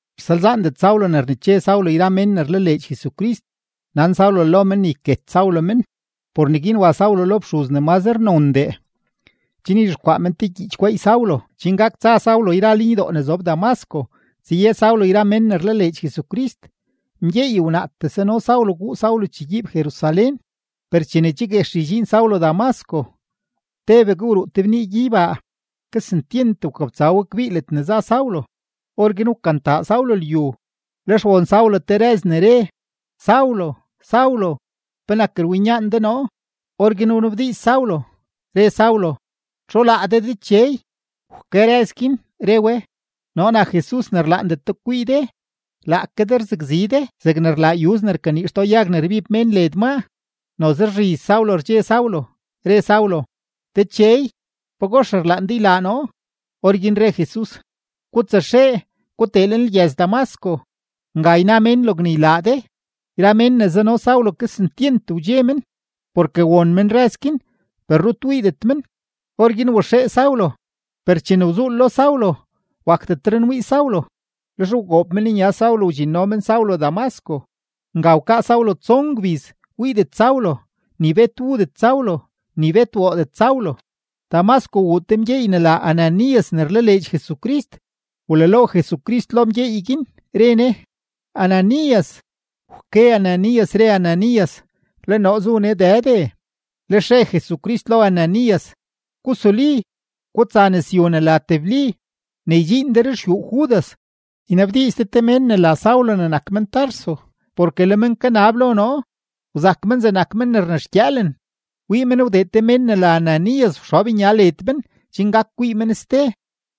Rsalzaandet Saulo ne rneche Saulo yra mén ne rlaleedx Jesucrist, nan Saulo lo men ne yket Saulo men. Por neguin wa Saulo lo fxuz ne mazre nondee, chen yzhexkwaa men te gyiich gweey Saulo chen gak tsa Saulo yra lenydoo ne zob Damasco, tsaye Saulo yra mén ne rlaleedx Jesucrist, mgyeey wnaatee sano Saulo guu Saulo chegyiib Jerusalén. Per chene che guex ydxiin Saulo Damasco, tebegue wruu te bnii gyeybaa, kesentyent wkabtsa we kbii ledne za Saulo. Orguin wkantaa Saulo lyu, lex won Saulo te rëz ne re: ―Saulo, Saulo, ¿penak rwinyaan de noo? Orguin wnabdiiz Saulo, re Saulo: ―¿Txu laa de Dechey? Wke rëz guin, re we: ―Noo nak Jesus ne rlaandet de kwii de. Laake de rzakzi de zegne rlaa yuz ne rkanii xtoo yag ne rbib mén led maa. Noze rzhiz Saulo rdxe Saulo, re Saulo: ―Dechey, ¿pagox rlaan de ylaa noo? Orguin re Jesus: ―Gutsaxee, gutee lenlgyëz-Damasco. Nga yna mén logne ylaa de. Yra mén ne zano Saulo kesentyent wdxe men, porke won men rëz guin per rut wiidet men. Orguin waxee Saulo, per chene wzuul lo Saulo, wakdetre nwii Saulo. Lex wgoob men nya Saulo wdxinno men Saulo Damasco. Nga wkaa Saulo tson gbiz wiidet Saulo, ni bet wudet Saulo, ni bet woodet Saulo. Damasco wuu te mgyeey ne la Ananías ne rlaleedx Jesucrist; wlalo Jesucrist lo mgyeey guin, re Ne: ―¡Ananías! Wke Ananías, re Ananías: ―Le noo zu nee Dëde. Lex re Jesucrist lo Ananías: ―Gusuli, gutsa nëzyu ne la Tebli; ne ydxiin de ruxyuu Judas, ynabdiiz de te mén ne la Saulo ne nak men-Tarso, porke le men kanab lo noo. Wzak men zegnak men ne rnexgyëëlen, wii men wdee te mén ne la Ananías wxob nya led men chen gak kwii men ste.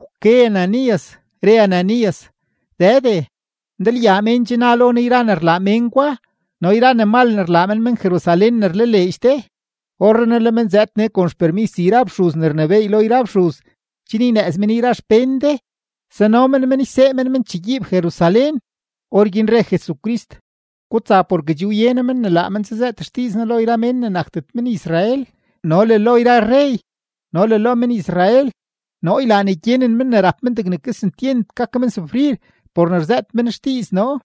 Wke Ananías, re Ananías: ―Dëde, ndalyaa mén che na lo noo yra ne rlaa mén gwa no yra ne mal ne rlaa men men-Jerusalén ne rlaleedx de. Orrenaa le men zëëd nee kon xpermis yra fxuz ne rnebééy lo yra fxuz chen ynëëz men yra xpén de, sano men men ysee men men chegyiib Jerusalén. Orguin re Jesucrist: ―Gutsa porke che wye noo men ne laa men tsazëët xdiiz noo lo yra mén ne nakdet men-Israel no le lo yra rrey no le lo men-Israel. Noo ylaa ne gyenen men ne rap men degne kesentyent gak men sufrir por ne rzëët men xdiiz noo.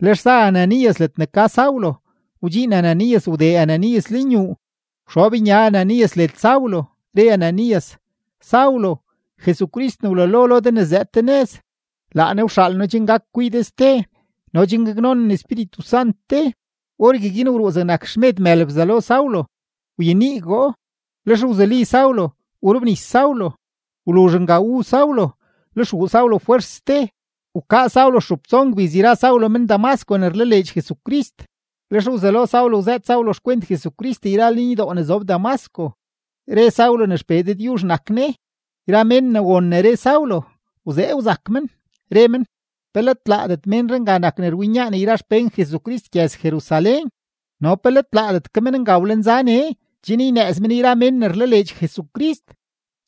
Lex za Ananías ledne ka Saulo, wdxiin Ananías wdee Ananías lenyuu, wxob nya Ananías led Saulo, re Ananías: ―Saulo, Jesucrist ne wlalo lo de ne zëëd de nëz, laa Ne wxaal noo chen gak kwii de ste no chen gaknonen Espíritu Sant de. Orgueguin wruu zegnak xmed mël bzalo Saulo, wyeniigoo. Lex wzuli Saulo, wrobnis Saulo. Wluzh nga wu Saulo, lex wuu Saulo fwers ste. Wkaa Saulo stxup stson gbiz yra Saulo men-Damasco ne rlaleedx Jesucrist. Lex wzelo Saulo wzëët Saulo xkwent Jesucrist yra lenydoo ne zob Damasco, re Saulo ne XPee Dëdyuzh nak Ne. Yra mén ne won ne re Saulo, wzee wzak men, re men: ―¿Pe let laadet ménree nga nak ne rwinyaan yra xpén Jesucrist gyëz-Jerusalén? No ¿pe let laadet ke men nga wlenza nee chen ynëëz men yra mén ne rlaleedx Jesucrist,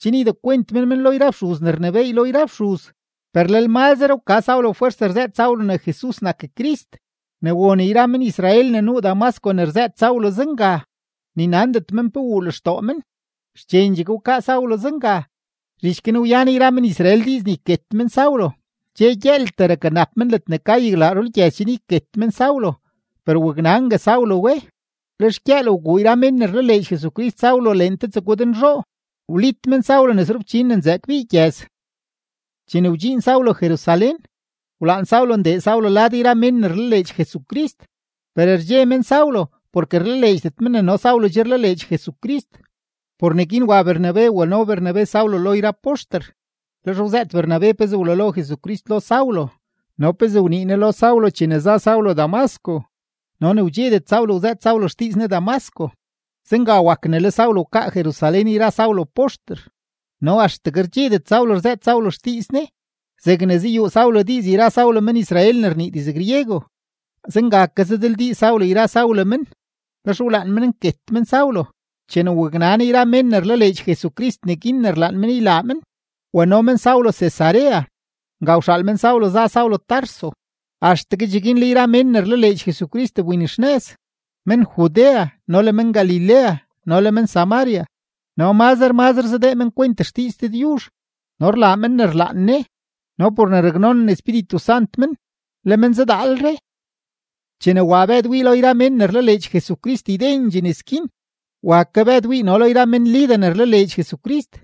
chen ydekwent men men lo yra fxuz ne rnebééy lo yra fxuz? Per lel mazre wka Saulo fwers rzëët Saulo ne Jesus nak Crist; ne won yra men-Israel ne nuu Damasco ne rzëët Saulo zenga, ni nandet men pe wuu lextoo men. Xchendxegue wkaa Saulo zenga; zhich guin wyan yra men-Israel diiz ne yket men Saulo. Dxe gyëëltee rakanap men ledne ka yaglaa rulgyëz chen yket men Saulo; per waknangue Saulo we. Lex gyëël wguu yra mén ne rlaleedx Jesucrist Saulo leen te tsegwed nzhoo, wlit men Saulo nes rufchin ne nzëë kbii gyëz. Chene wdxiin Saulo Jerusalén, wlaan Saulo ndee Saulo lad yra mén ne rlaleedx Jesucrist. Per rdxe men Saulo porke rlaleedxdet men ne no Saulo che rlaleedx Jesucrist. Por neguin wa Bernabe wano Bernabe Saulo lo yra poxter. Lex wzëët Bernabe pezee wlalo Jesucrist lo Saulo no pezee wnii Ne lo Saulo chene za Saulo Damasco no ne wdxedet Saulo wzëët Saulo xdiiz Ne Damasco. Zenga wak ne le Saulo wkaa Jerusalén yra Saulo poxter no axtegue rdxedet Saulo rzëët Saulo xdiiz Ne. Zegne zayuu Saulo diiz yra Saulo men-Israel ne rnii diz-griego, zenga ke zadildiiz Saulo yra Saulo men, lex wlaan men nket men Saulo. Chene waknan yra mén ne rlaleedx Jesucrist neguin ne rlaan men ylaa men, wano men Saulo Cesarea; nga wxaal men Saulo za Saulo Tarso. Axtegue cheguin le yra mén ne rlaleedx Jesucrist wbinxnëz, men-Judea no le men-Galilea no le men-Samaria. No mazre mazre zadee men kwent xdiiz Dëdyuzh, no rlaa men ne rlaan Ne, no por ne raknonen Espíritu Sant men, le men zadaalre. Chene wa Bëd wii lo yra mén ne rlaleedx Jesucrist ydendxee nes guin, wa ke Bëd wii no lo yra men-Lida ne rlaleedx Jesucrist.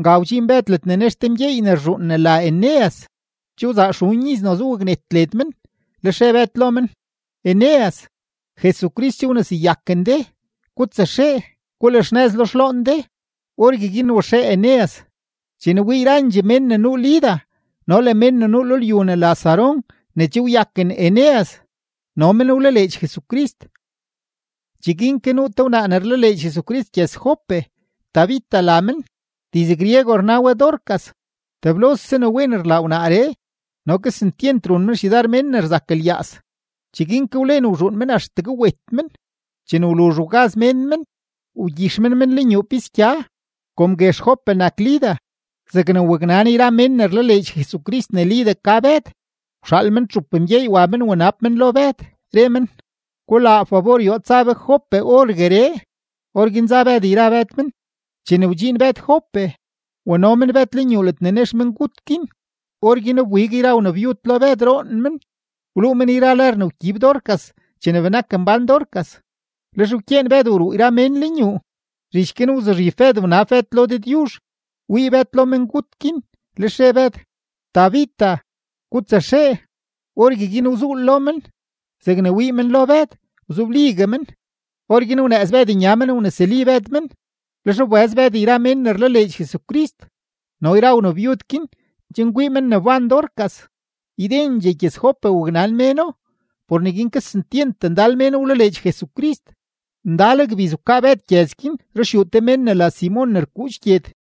Nga wdxiin Bëd ledne nex te mgyeey ne rzhuun ne la Eneas. Che wzaa xun iz noze waknet led men. Lex re Bëd lo men: ―Eneas, Jesucrist che wneseyaken de; gutsaxee, gulaxnëz lo xloon de. Orgueguin waxee Eneas. Chene wii yrandxee mén ne nuu Lida no le mén ne nuu lo lyu ne la Sarón ne che wyaken Eneas, no men wlaleedx Jesucrist. Cheguin ke nuu te wnaa ne rlaleedx Jesucrist gyëz-Jope, Tabita la men (diz-griego rna we Dorcas). Teblose ne wen rlaa wnaaree no kesentyent run men xyudar mén ne rzak lyaaz. Cheguin ke wlen wzhuun men axtegue wet men. Chene wluzh wgaz mén men, wgyix men men lenyuu pisgya. Kom guex Jope nak Lida, zegne waknan yra mén ne rlaleedx Jesucrist ne Lida ka Bëd, wxaal men txup mgyeey wa men wnab men lo Bëd, re men: ―Gulaa fabor yoo tsa be Jope orgueree. Orguin za Bëd yra Bëd men. Chene wdxiin Bëd Jope, wano men Bëd lenyuu ledne nex mengut guin. Orguin wbig yra wnabyud lo Bëd roon men, wluu men yra lër ne wgyib Dorcas chene benak mbán Dorcas. Lex wkyeen Bëd wruu yra mén lenyuu; zhich guin wzuzhib Bëd wnab Bëd lo Dëdyuzh; wii Bëd lo mengut guin, lex re Bëd: ―Tabita, gutsaxee. Orgueguin wzuul lo men; zegne wii men lo Bëd, wzobligue men. Orguin wnëëz Bëd nya men wnesuli Bëd men; lex wbëz Bëd yra mén ne rlaleedx Jesucrist no le yra wnabyud guin chen kwii men ne wban Dorcas. Ydendxee gyëz-Jope waknan méno; por neguin kesentyent ndal mén wlaleedx Jesucrist. Ndal gbiz wkaa Bëd gyëz guin ruxyuu te mén ne la Simon ne rkuudx gyed.